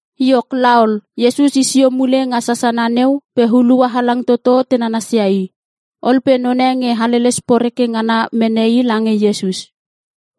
Iok laol, Iesus i sio mule nga sasana neu pe hulua halang toto te nanasia i. Ol pe none nge haleles poreke ngana mene i lange Iesus.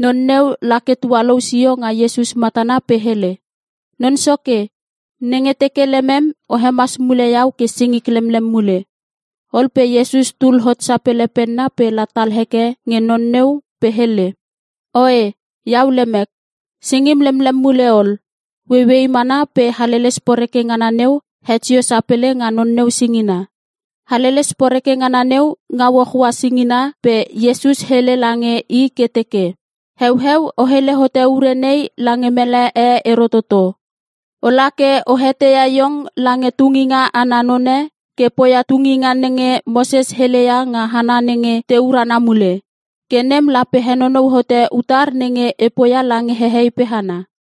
Non neu lake tualou sio nga Iesus matana pe hele, “Non Soke, nenge teke lemem o hemas mule iau ke singik lemlem mule.” Ol pe Iesus tul hot sapele penna pe la tal heke nge non neu pe hele, “Oe iau lemek. Singim lemlem mule ol.” Ueiuei mana pe haleles poreke ngana neu het sio sapele nga non neu singina. Haleles poreke ngana neu ngau hohoa singira. Pe Iesus hele lange i ke teke, “Heueu o hele hote ure nei lange mele e ero toto. Ola ke o eteia iong lange tunginga ana none ke poia tunginga nenge Moses hele ia nga hana nenge te urana mule. Ke nem lape henonou hote utar nenge e poia lange hehei pe hana.”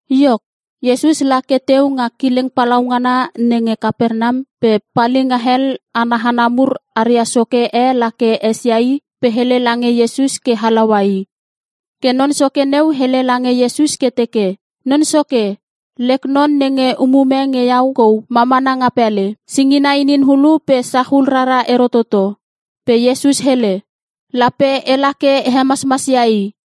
Iok, Iesus la ke i teu nga kileng palaungana nenge Kapernam pe palinga hel ana hana mur aria soke e lake esia i pe hele lange Iesus ke halaua i. Ke non soke neu hele lange Iesus ke teke, “Non Soke, lek non nenge umume nge iau kou ma mana nga pele. Singina inin hulu pe sachul rara ero toto.” Pe Iesus hele, “Lape e la ke e hemasmasia i.”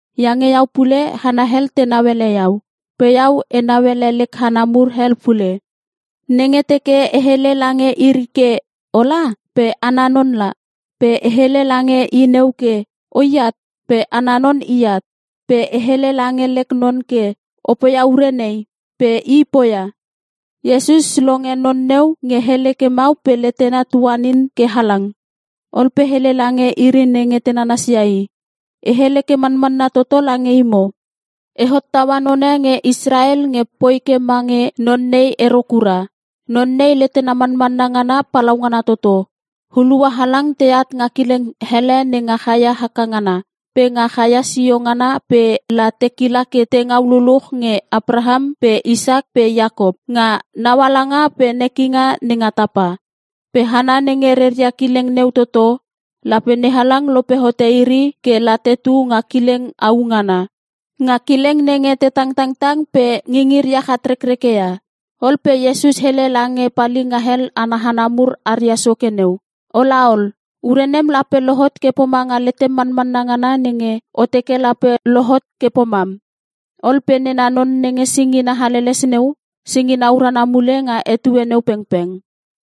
Iange iau pule hana hel tenau ele iau. Pe iau enau ele lek hana mur hel pule. Nenge teke e hele lange iri ke, ‘Ola,’ pe ana non la. Pe e hele lange i neu ke, ‘O iat,’ pe ana non i at. Pe e hele lange lek non ke, ‘O poia ure nei,’ pe i poia.” Iesus longe non neu nge hele ke mau pe letena tuanin ke halang. Ol pe hele lange iri nenge te nanasia i, “E hele ke manmanna toto lange imo, e hottaua none nge Israel nge poi ke mange non nei ero kura. Non nei letena manmanna ngana palaungana toto. Hulua halang teat nga kileng hele nenga chaia haka ngana, pe nga chaia sio ngana pe la te kila ke te ngau luluch nge Apraham pe Isak pe Iakop, nga naualanga pe nekinga nenga tapa. Pe hana nenge reria kileng neu toto, lape NeHalang lope hote iri ke la tetu nga kileng au ngana. Nga kileng nenge te tangtang pe ngingiria chatrekreke ia.” Ol pe Iesus hele lange palinga hel ana hana mur aria soke neu, “O laol, Ure nem lape lohot ke pomanga letem manmanna ngana nenge o teke lape lohot ke pomam. Ol pe nena non nenge singina haleles neu, singina urana mule nga etue neu pengpeng.”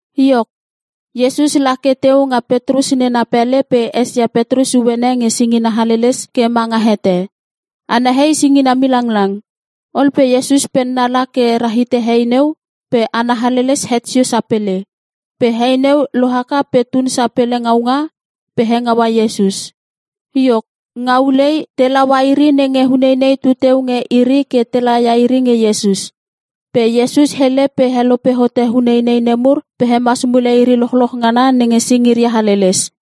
Iok, Iesus la ke i teu nga Petrus nena pele pe esia Petrus uene nge singina haleles ke ma nga hete. Ana hei singina milanglang. Ol pe Iesus penna la ke rahite hei neu pe ana haleles het sio sapele. Pe hei neu lo haka pe tun sapele ngaunga pe hengaua Iesus. Iok, nga ulei te laua iri nenge uneinei tu teu nge iri ke te laia iri nge Iesus. Pe Iesus hele pe helope hote uneinei nemur pe hemas mule iri lochloch ngana nenge singiria haleles.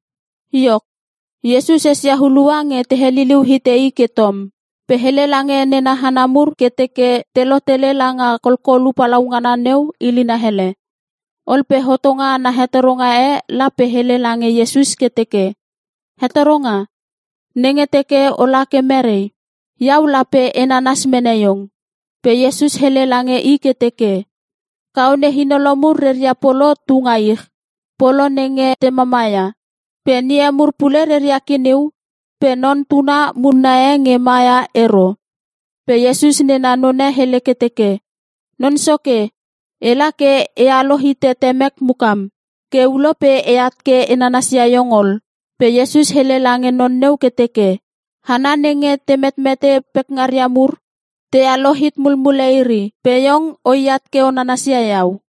Iok, Iesus esia hulua nge te heliliu hite I ke tom, pe hele lange nena hana mur ke teke te lotele langa kolkolu palaungana neu ilina hele. Ol pe hotonga ana hetoronga e la pe hele lange Iesus ke teke, “Hetoronga, nenge teke o la ke merei, iau lape e nanas mene iong.” Pe Iesus hele lange i ke teke, “Kaone hinolo mur reria polo tu nga ich, polo nenge te mamaia. Pe ngie mur pule reria kiniu, pe Non Tuna munna e nge mama ia ero.” Pe Iesus nena none hele ke teke, “Non Soke, e la ke e alo hite temek mukam, ke ulo pe e at ke e nanasia iong ol.” Pe Iesus hele lange non neu ke teke, “Hana nenge te metmete pekngaria mur te alo hit mulmule iri. Pe iong o iat ke o nanasia iau.”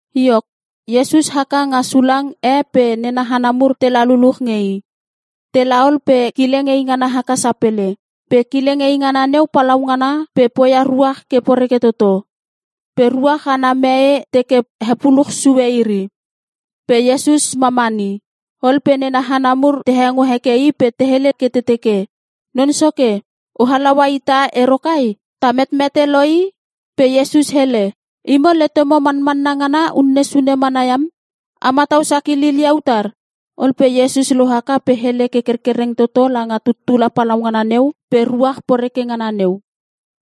Iok, Iesus haka nga sulang e pe nena hana mur tela luluch nge I. Te la ol pe kileng eingana haka sapele. Pe kileng eingana neu palaungana pe poia ruach ke poreke toto. Pe ruach ana mee teke hepuluch sue iri. Pe Iesus mamani. Ol pe nena hana mur te hengo heke I pe te hele ke te teke, “Non Soke, o halaua ita ero kai? Ta metmete lo i!” Pe Iesus hele, “Imo letemo manmanna ngana unne sune mana iam. A matau sakilil ia utar?” Ol pe Iesus lo haka pe hele ke kerkereng toto langa tuttula palaungana neu pe ruach poreke ngana neu.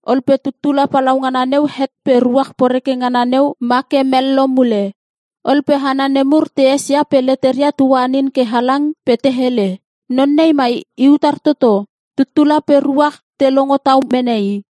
Ol pe tuttula palaungana neu het pe ruach poreke ngana neu ma ke mello mule. Ol pe hana nemur te esia pe leteria tuanin ke halang pe te hele, “Non nei mai i utar toto? Tuttula pe ruach te longo tau mene I.”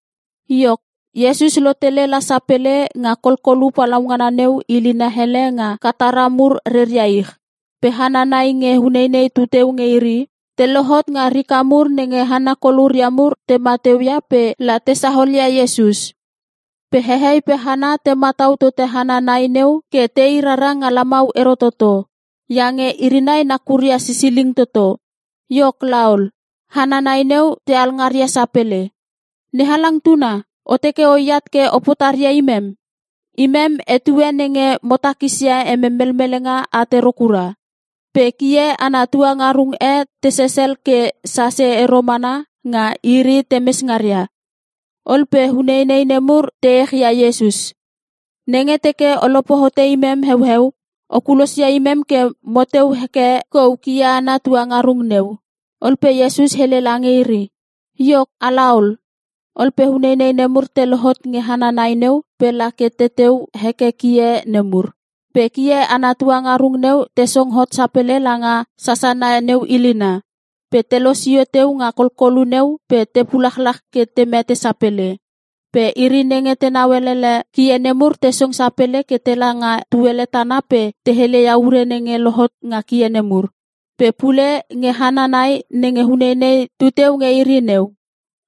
Iok, Iesus lo tele la sapele nga kolkolu palaungana neu ilina hele nga Katara mur reria ich. Pe hana nai nge uneinei tu teu nge iri. Te lohot nga rika mur nenge hana koluria mur tema teu ia pe la te saolia Iesus. Pe hehei pe hana te matau tote hana nai neu ke te i rara nga lamau ero toto. Iange iri nai nakuria sisiling toto. Iok laol, hana nai neu te alngaria sapele, “NeHalang Tuna, o teke oat ke o potaria ia imem? Emem etue nenge mo takisia emem melmelenga at ero kura.” Pe kie ana tuangarung e te sesel ke sase ero mana nga iri te mes ngaria. Ol pe uneinei nemur te echia Iesus, “Nenge teke o lope hote imem heueu, o kulosia imem ke mo teu heke kou kie ana tuangarung neu.” Ol pe Iesus hele lange iri, “Iok, a laol!” Ol pe uneinei nemur te lohot nge hana nai neu pe la ke teteu heke kie nemur. Pe kie ana tuangarung neu te song hot sapele langa sasana neu ilina, pe te losio teu nga kolkolu neu pe te pulachlach ke te mete sapele. Pe iri nenge tenau elele kie nemur te song sapele ke tela nga tuele tana pe te hele ia ure nenge lohot nga kie nemur, pe pule nge hana nai nenge uneinei tu teu nge iri neu.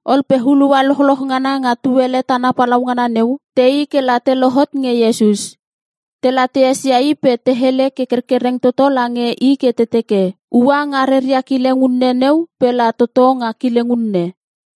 Ol pe hulua lochloch ngana nga tuele tana palaungana neu, te i ke la te lohot nge Iesus. Te la te esia I pe te hele ke kerkereng toto lange I ke te teke, ua nga reria kileng unne neu pe la toto nga kileng unne.